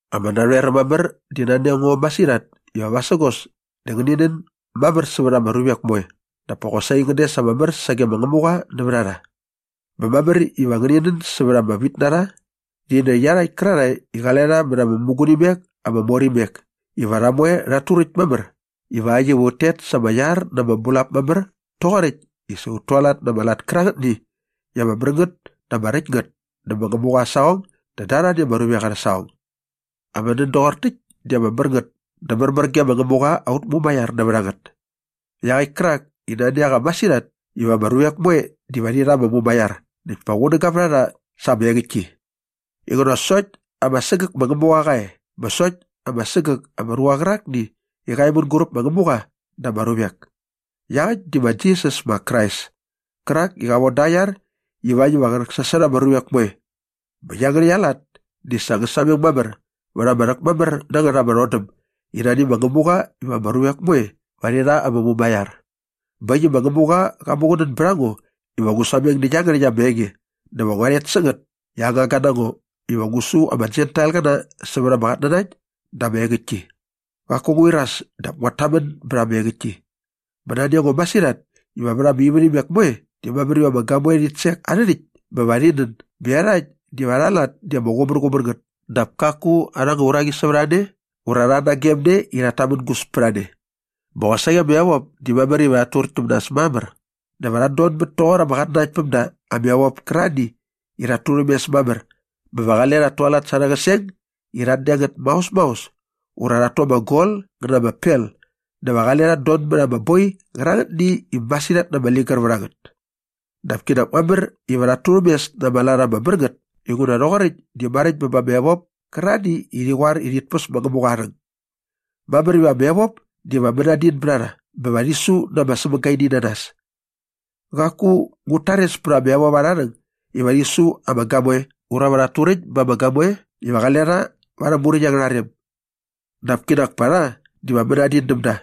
Ama narhoeräm mamär di nani a ngo masirhat iva vasägos dä va ngäni nän mamär sävät ama ruvek moe dap pa qosaqi ngän des ama mär sage ma Ngämuqa nävät a rha. Bä mamär iva ngäni nän sävät ama vitnarha rhi nä iarhakt kärarhae i qale rha mät ama mämugunimek ama mor imek iva rha moe rhat turäkt mamär ivakt iva ut tet sa ama iar na ama bulap mamär toqoräkt i sa ut tualat na ama lat kärangätni i ama mär ngät dä ama räkt ngät dä ma Ngämuqa aa saqong dä da arhani ama ruvek arhä saqong. Ama nän doqor täkt di ama mär ngät dä märmär ge ma Ngämuqa aut Mumaiar nävät a ngät iaqäkt kärak i nani a qa masirhat iva ama ruvek moe diva rhi rha ama mumaiar näkt pa qunäga vät a rha sa ama engäktki inguna sokt ama sägäk ma Ngämuqa qa e bä sokt ama sägäk ama ruqa qärakni i qa e mänguräp ma Ngämuqa dä ama ruvek. Iaqäkt di ma Jisas ma Krais kärak i qa von da aa iar ivakt iva qä rhäksasot ama ruvek moe. Bä iangärhäkt aa lat di sa ngä sameng mamär vät ama rhäkmamär na ngät ama rhodäm i nani ma Ngämuqa iva ama ruvek moe va rhi rha ama mumaiar. Bä äkt i ma Ngämuqa qa muqunän bät a ngo iva ngu sameng nä iangärhäkt ama enge dä va ngua rhet sä ngät i aa ngangga na ngo iva ngu su ama Jentailqäna sävät ama qatnanakt dä ama engäktki. Qaku ngu iras dap nguat tamän bät ama engäktki. Bä nani a ngo masirhat iva vät ama ivärhimek moe di mamär iva ama gamoe rhit sek arhä rhäkt bä va rhi nän bä iarhakt diva arha lat di ama qumärqumär ngät dap kaku arha anga uraqi sävät a ne ura rha nagemne i rhat tamängus pät a ne. Bä qosaqi ama evop di mamär iva rhat turäkt täm nas mamär dä va rhat donmät toqor ama qatnanakt päm da ama evop kärarhani i rhat turhämes mamär bä va qale rhat tualat sa arhä qäseng i rhat deng ngät maos maos ura rhat tu ama gol ngä na ama pel dä va qale rhat don mät ama boi qärangätni i masirhat na ama ligär vät a ngät. Dap kinak mamär iva rhat turhäm mes na ama lat ama mär ngät inguna rhoqoräkt di maräkt bä ba ama evop kärarhani i rhi qoar i rhit päs ma Ngämuqa aa rhäng. Mamär iva ama evop diva mänadin bät a rha bä va rhi su na ama sämagaininanas. Qaku ngut tares pät ama evop arha rhäng iva rhi su ama gamoe ura va rhat turäkt ba ama gamoe iva qale rha va arhä muräkt angärha rem. Dap kinak pa rha diva mänadin däm da.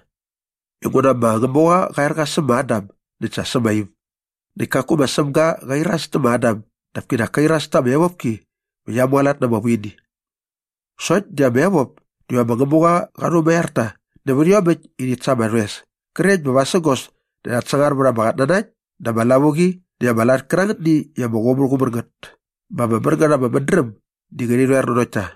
Inguna ma Ngämuqa qa er qa säm ma Adam näkt sa sä ma Iv näkt kaku ma Sämga qa iras tä ma Adam dap ka iras ta ama evopki bä qia mualat na ama vuini. Sokt di ama evop diva ma Ngämuqa qa rhumaiar ta nävät iomäkt i rhit sa ama rhoes krekt bä vasägos dä rhat sangar sävät ama qatnanakt dä ama lavuqi näkt ama lat kärangätni i ama qumärqumär ngät bä ama mär ngät ama mädräm di ngärhi rhoer nanokt ta.